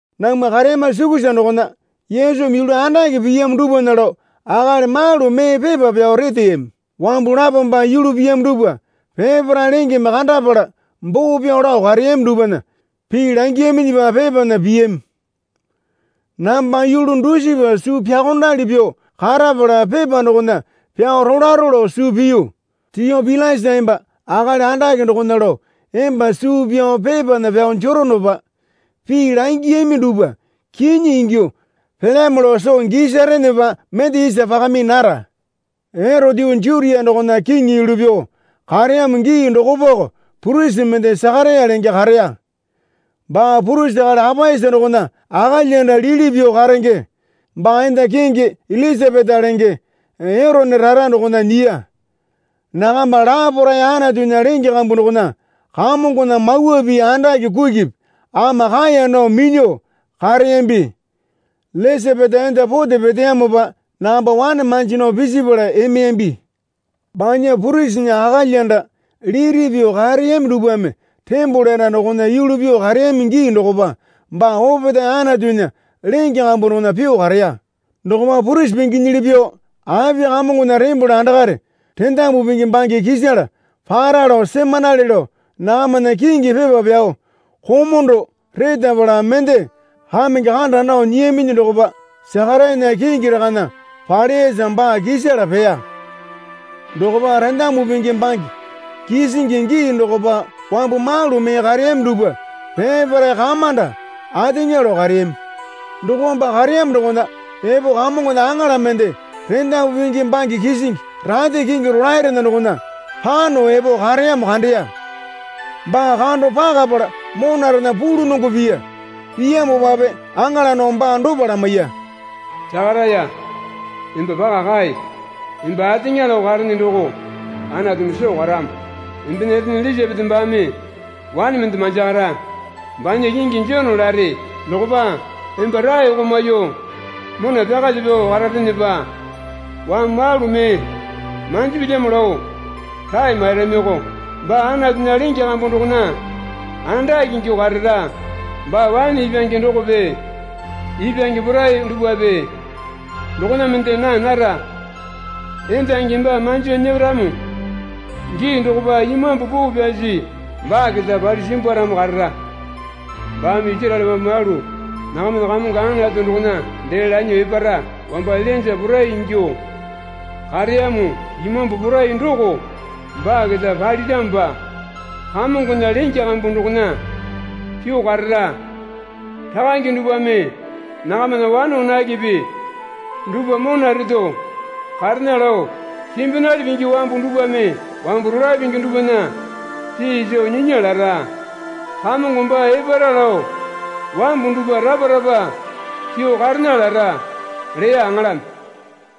Namwa kareyama sukusa dokona Yesumi yulu andake piyamo dupwana lao akali malu mee pepa pyao reteyami. Wambu lapome baa yulu piyamo dupwa peparae lengeme kandapala boo pyao lao kareyami dupwana pii langiyaminyipa pepana piyami. Namba yulu dusipa suu pyaokondali pyuo karapala pepa dokona pyao rolaro lao suu piyu. Tiopilasa emba akali andake dokona lao emba suu pyao pepana pyao jeronopa pii langiyami dupwa kinyi ingyuo pelyamo lao soo gisarenepa mende isa pakami nara. Erote yuu Jutia dokona kiŋi yulu pyuo kareyamo gii dokopako purisi mende Sakaraya lenge kareya. Baa purisi akali Apaisa dokona akalyanda lili pyuo karenge. Baa enda kingi Ilisapeta lenge Erone rara dokona nyiya. Nakamba laparae Anatunya lenge kambu dokona Kamongona mawa pii andake kukipi ama kaeya nao minyuo kareyambi. Ilisapeta enda pote peteyamopa nakamba wane manji nao pisipala emeyambi. Banya purisinya akalyanda liti pyuo kareyami dupwame tembole anda dokona yulu pyuo kareyami gii dokopa baa opetae Anatunya lenge kambu dokona pyuo kareya. Dokopa purisi pinginyili pyuo api Kamongona tembole andakare rendamu pingi bange kisala para lao semanale lao nakamana kingi pepa pyao komondo retapala mende kamenge kanda nao nyiyaminyi dokopa Sakarayana kingi rakana paleyasa baa kisala peya. Dokopa rendamu pingi bange kisingi gii dokopa wambu malu mee kareyami dupwa peparae kamanda ateŋa lao kareyami. Dokopa baa kareyamo dokona epo Kamongona aŋala mende rendamu pingi bange kisingi rate kingi rolaerena dokona pano epo kareyamo kandeya. Baa kando pakapala monarename pulunongo piya. Piyamopape aŋala dokome baa dopa lamaiya. Sakaraya, emba paka kae. Emba ateŋa lao karene doko Anatumi soo karamo. Embena etene Ilisapeta baame wane mende manjakara. Banya kingi Jone lare. Dokopa emba raeko maiyuo mona pyakalyuo pyao kararenepa wambu malu mee manjipilyamo lao rae mairamiko. Baa Anatunya lenge kambu dokona andake ingyuo karara. Baa waene ipwange dokope ipwange porai dupwape dokona mende naa nara. Endangimi baa manjo nyeramo gii dokopa Imambu Poo Pyasi baa keta palyuo simbwaramo karara. Baame Isaraele wambu malu nakamana Kamongo Anatu dokona dee lanyuo epara. Wamba Ilainja porai ingyuo kareyamo imambu porai doko baa keta paliramopa Kamongona lenge kambu dokona pyuo karara. Rakange dupwame nakamana wane wanakepe dupwa mona reto karena lao simbinali pingi wambu dupwame wambu rolae pingi dupwana pii soo nyinya lara. Kamongo baa epara lao wambu dupwa rapa rapa pyuo karena lara, leya aŋalame.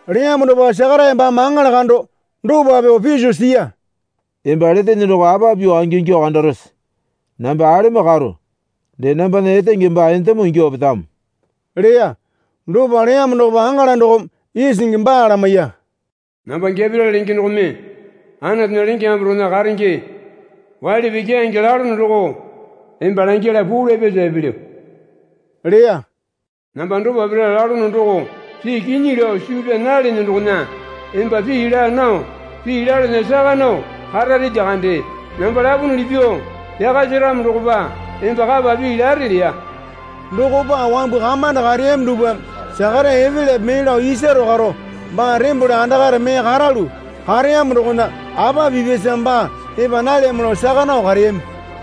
Leyamo dokopa Sakaraya baame aŋala kando dopa pyuo piso siya. Emba letene doko apa pyuo angingyuo kandarose? Namba alemo karo dee nambana etenge baa endemo ingyuo petamo, leya. Dopa leyamo dokopa aŋala dokome isingi baa lamaiya. Namba Geperiele lenge dokome Anatunya lenge kambu dokona karenge. Waili pii keyange lalono doko emba langyala puu lapyasa epelyo, leya. Namba dopa pira lalono doko pii kinyi lao suu pyaa nalene dokona emba pii laa nao pii lalana saka nao karare lyakande. Namba lapunuli pyuo pyaka separamo dokopa emba kapa pii lare, leya. Dokopa wambu kamanda kareyami dupwame Sakaraya epelyape mee lao isaro karo baa tembole andakare mee karalu kareyamo dokona apa pipyasa baa epa nalyamo lao saka nao kareyami.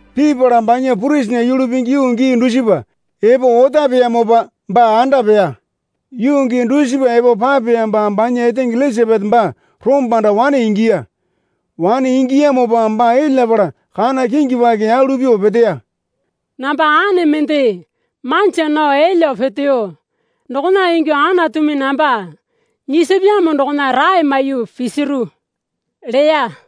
Pipala banya purisinya yulu pingi yuu gii dusipa epo otapeyamopa baa anda peya. Yuu gii dusipa epo papeyamopa banya etenge Ilisapeta baa rombanda wane ingiya. Wane ingiyamopa baa elyapala kana kingi paki yalu pyuo peteya. Namba ane mende manja nao elyuo peteyo dokona ingyuo Anatumi namba nyisapyamo dokona rae maiyuo pisiru leya.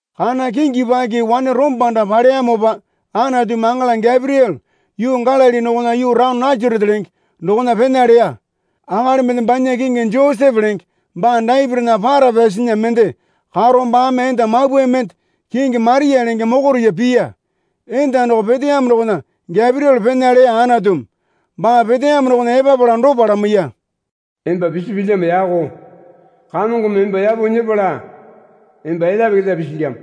Kana kingi paki wane rombanda paleyamopa Anatumi aŋala Geperiele yuu Galili dokona yuu taone Nasarete lenge dokona pena leya. Akali mende banya kingi Josepe lenge baa Dapitinya para pyasinya mende karo baame enda mapwae mende kingi Maria lenge mokoriya piya. Enda doko peteyamo dokona Geperiele pena leya Anatumi. Baa peteyamo dokona epapala dopa lamaiya. Emba pisipilyamo yako. Kamongome emba yapo nyepala emba elyape keta pisilyamo.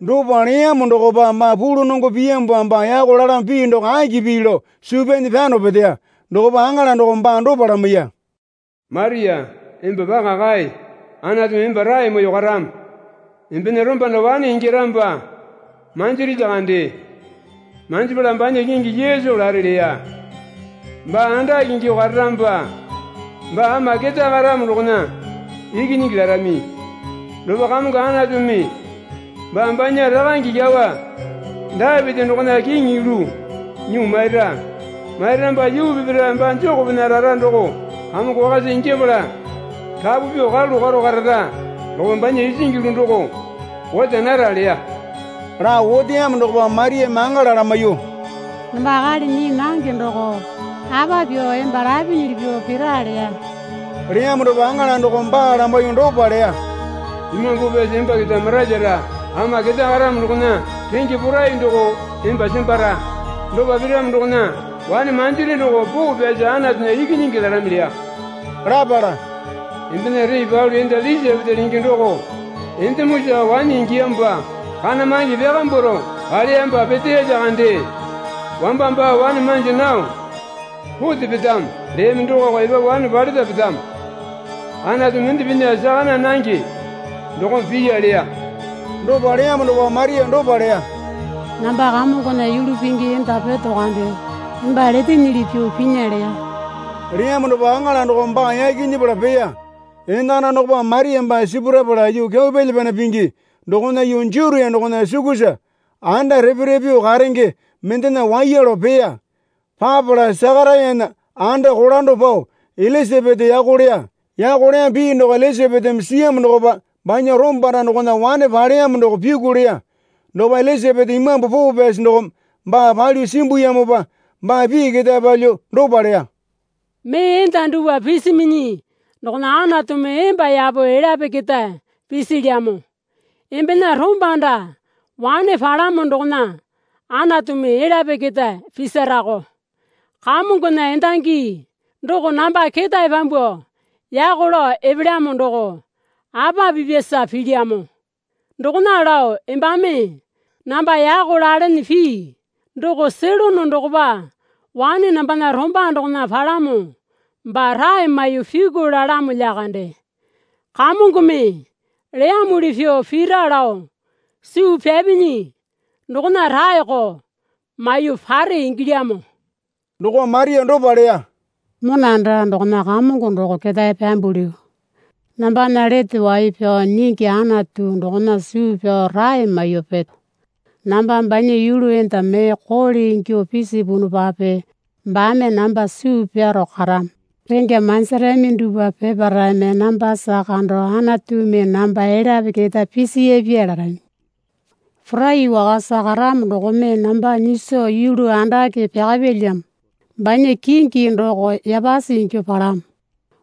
Dopa leyamo dokopa baa pulunongo piyamopa baa yako lalamo pii doko aki pii lao suu pyanyi pyano peteya. Dokopa aŋala dokome baa dopa lamaiya. Maria, emba paka kae. Anatumi emba rae maiyuo karamo. Embena rombanda wane ingyaramopa manjiri lyakande. Manjipala banya kingi Yesu lare, leya. Baa andake ingyuo kararamopa baa Ama Ketae Karamo dokona Ikinyingi larami. Dokopa Kamongo Anatumi baa banya rakange kyawa Dapiti dokona kiŋi yulu nyuo maira. Mairamopa yuu peparae baa Jekopena rara doko kamongo wakasa ingyapala rapu pyuo karalu karo karara. Dokopa banya isingi yulu doko ota nara, leya. Lao oteyamo dokopa Mariame aŋala lamaiyuo, Namba akali nyii nange doko apa pyuo emba lapinyili pyuo pira? leya. Leyamo dokopa aŋala dokome baa lamaiyuo dopa leya. Imambu Poo Pyasi emba keta maralyara. Ama ketae karamo dokona renge porai doko emba sembara. Dopa piramo dokona wane manjiri doko Poo Pyasi Anatunya Ikinyingi larami, leya. Lapala, Embena ree palu enda Ilisapeta lenge doko endemosa wane ingiyamopa kana mange pyakambwaro paleyamopa peteya lyakande. Wamba baa wane manji nao pote petamo leyami dokoko epapu wane paleta petamo. Anatu mende pinya saka naa nange dokome piya, leya. Dopa leyamo dokopa Maria dopa leya. Namba Kamongona yulu pingi enda peto kande. Emba letenyili pyuo pinya, leya. Leyamo dokopa aŋala dokome baa yaki nyepala peya. Enakana dokopa Maria baa sipurapala yuu kyau pyalya pyana pingi dokona yuu Jutia dokona sukusa anda repe repe pyuo karenge mendena waiya lao peya. Papala Sakarayana anda kolando pao Ilisapeta yako leya. Yako leyamo pii doko Ilisapetame siyamo dokopa banya rombanda dokona wane paleyamo doko pyuku leya. Dokopa Ilisapeta Imambu Poo Pyasi dokome baa palyuo simbuyamopa baa pii ketae palyuo dopa leya. Mee enda dupwa pisiminyi dokona Anatumi emba yapo elyape keta pisilyamo, embena rombanda wane palamo dokona Anatumi elyape keta pisarako. Kamongona endangi doko namba ketae pyambuo yako lao epelyamo doko apa pipyasa pilyamo? Dokona lao embame namba yako lalene pii doko selono dokopa wane nambana romba dokona palamo baa rae maiyuo pyuku lalamo lyakande. Kamongome leyamuli pyuo pira lao suu pyapinyi dokona raeko maiyuo pare ingilyamo. Dokopa Maria dopa leya. Mona anda dokona Kamongo doko ketae pyambulyu. Nambana Lete Wai Pyao Nyingi Anatu dokona suu pyao rae maiyuo peto. Namba banya yulu enda mee koole ingyuo pisipunupape baame namba suu pyaro karamo. Rengya manjirami dupwa peparaeme nambasa kando Anatumi namba elyape keta pisiyapya larami. Porai Wakasa Karamo dokome namba nyiso yulu andake pyakapyalyamo. Banya kingi doko yapasi ingyuo palamo.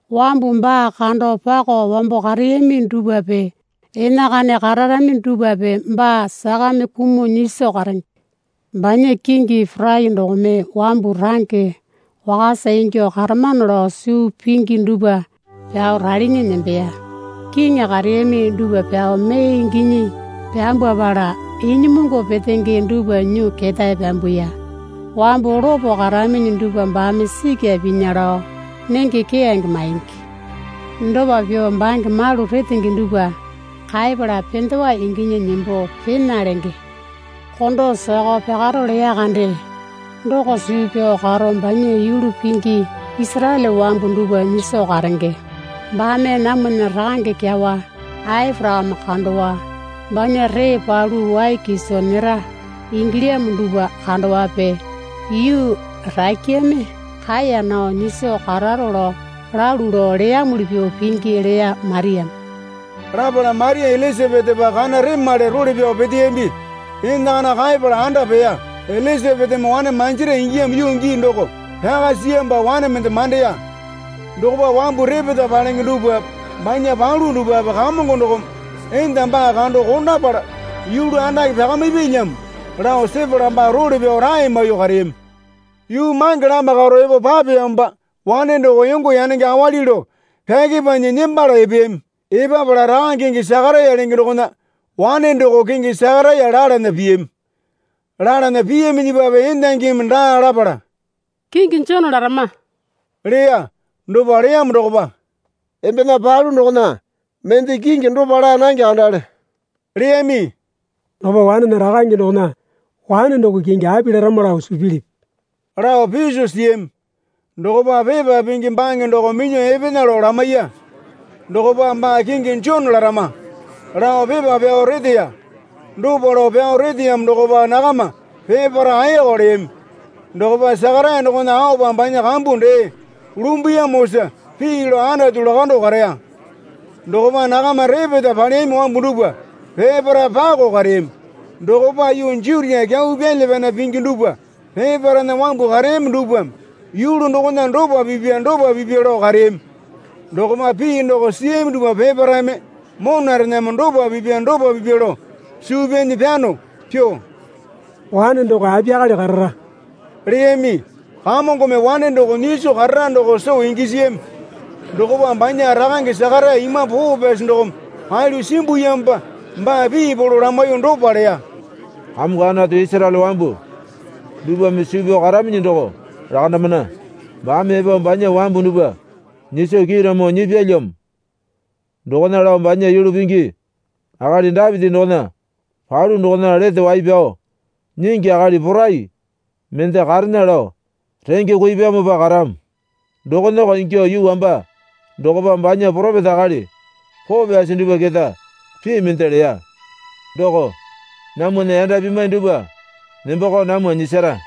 Wambu baa kando pako wambo kareyami dupwape enakana kararami dupwape baa sakame kumuo nyiso karenge. Banya kingi porai dokome wambu range wakasa ingyuo karamano lao suu pingi dupwa pyao ralinyi nembeya. Kiŋi kareyami dupwa pyao mee inginyi pyambwapala inyimungu petenge dupwa nyuo ketae pyambuya. Wambu lopo karaminyi dupwa baame sikya pinya lao nenge keyange maingi. Dopa pyuo bange malu retenge dupwa kaepala pendewa inginyi nembo pena lenge. Kondo sakao pyakaro leya kande doko suu pyao karo banya yulu pingi Isaraele wambu dupwa nyiso karenge. Baame namwana rakange kyawa Aporakame kandowa, banya ree palu wai kiso nyera ingilyamo dupwa kandowape yuu rakyame kaeya nao nyiso kararo lao, lalu lao leyamuli pyuo pingi, leya Mariame. Lapala Maria Ilisapetapa kana remale role pyao peteyambi. Enakana kaepala anda peya. Ilisapetame wane manjira ingiyamo yuu gii doko pyaka siyamopa wane mende mandeya. Dokopa wambu repeta palenge dupwape banya palu dupwape Kamongo dokome enda baa kando kondapala yulu andake pyakamipyalyamo lao sepala baa role pyao rae maiyuo kareyami. Yuu mange lama karo epo papeyamopa wane doko yongo yanenge awali lao pyakepanyi nembala epeyami. Epapala rakange kingi Sakaraya lenge dokona wane dopako kingi Sakaraya lalana piyami. Lalana piyaminyipape endangimi daa lapala, Kingi Jone larama, leya. Dopa leyamo dokopa, Embena palu dokona mende kingi dopa laa nange kandale, leyami. Dokopa wanena rakange dokona wane doko kingi api larama lao suu pilipi? lao piso siyami. Dokopa pepa pingi bange doko minyuo epena lao lamaiya. Dokopa, Baa kingi Jone larama, lao pepa pyao reteya. Dopa lao pyao reteyamo dokopa nakama peparae ayaka leyami. Dokopa Sakaraya dokona aopa banya kambu dee lumbuyamosa pii lao Anatu lakando kareya. Dokopa nakama repeta paleyami wambu dupwa peparae pako kareyami. Dokopa yuu Jutia kyau pyalya pyana pingi dupwa peparaena wambu kareyami dupwame yulu dokona dopa pipya dopa pipya lao kareyami. Dokopa pii doko siyami dupwa peparaeme monarename dopa pipya dopa pipya lao suu pyanyi pyano pyuo, Wane doko apiyakale karara, leyami. Kamongome wane doko nyiso karara doko soo gisiyami. Dokopa banya rakange Sakaraya Imambu Poo Pyasi dokome palyuo simbuyamopa baa pii polo lamaiyuo dopa leya. Kamongo Anatu Isaraele wambu dupwame suu pyao karaminyi doko lakandamana. Baame epo banya wambu dupwa nyiso kiiramo nyipyalyamo. Dokona lao banya yulu pingi akali Dapiti dokona palu dokona Lete Wai Pyao Nyingi akali porai mende karena lao renge kuipyamopa karamo. Dokonako ingyuo yuu wamba dokopa banya poropeta akali poo pyasi dupwa keta pii mende leya. Doko, Namwana yanda pimwai dupwa nembakao namwa nyisara,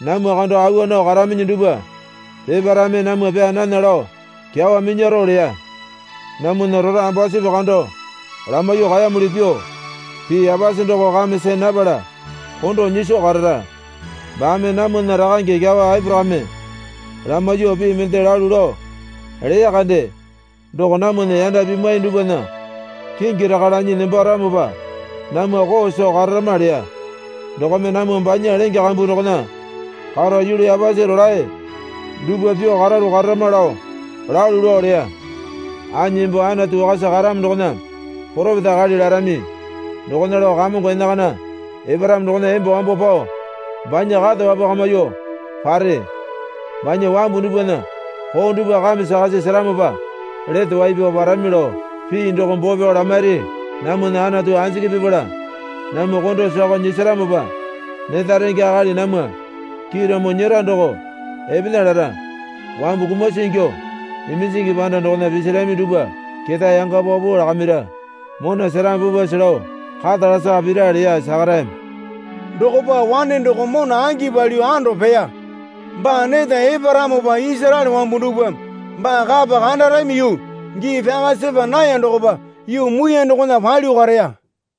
namwa kando awa nao karaminyi dupwa peparaeme namwa pyaa nana lao kyawa minyaro leya. Namwana rora ambasupi kando lamaiyuo kaeyamuli pyuo, pii yapasi doko kame see napala kondo nyiso karara. Baame namwana rakange kyawa Aporakame lamaiyuo pii mende lalu lao leya kande. Doko namwana yanda pimwai dupwana kingi raka lanyi nembaramopa namwa koo soo kararama leya. Dokome namwa banya lenge kambu dokona karo, yulu yapasi rolae dupwa pyuo karalu kararama lao lalu lao leya. Anyi emba Anatu Wakasa Karamo dokona poropeta akali larami. Dokona lao Kamongo enakana eparamo dokona emba wambo pao banya kata wapwakamyuo pare, banya wambu dupwana koo dupwa kame sakasi seramopa lete wai pyao parami lao pii doko boo pyao lamairi. Namwana Anatu anjiki pipala namwa kondo sakao nyisaramopa, neta renge akali namwa kiiramo nyera doko epena lara. Wambu kumasi ingyuo iminjingi panda dokona pisirami dupwa keta yanga paupau lakamira, mona seramo pupwase lao kata lasaka pira, leya Sakarayame. Dokopa wane doko mona angi palyuo ando peya. Baa neta eparamopa Isaraele wambu dupwame baa kapa kandarami yuu gii pyaka sepa naya dokopa yuu muiyane dokona palyuo kareya.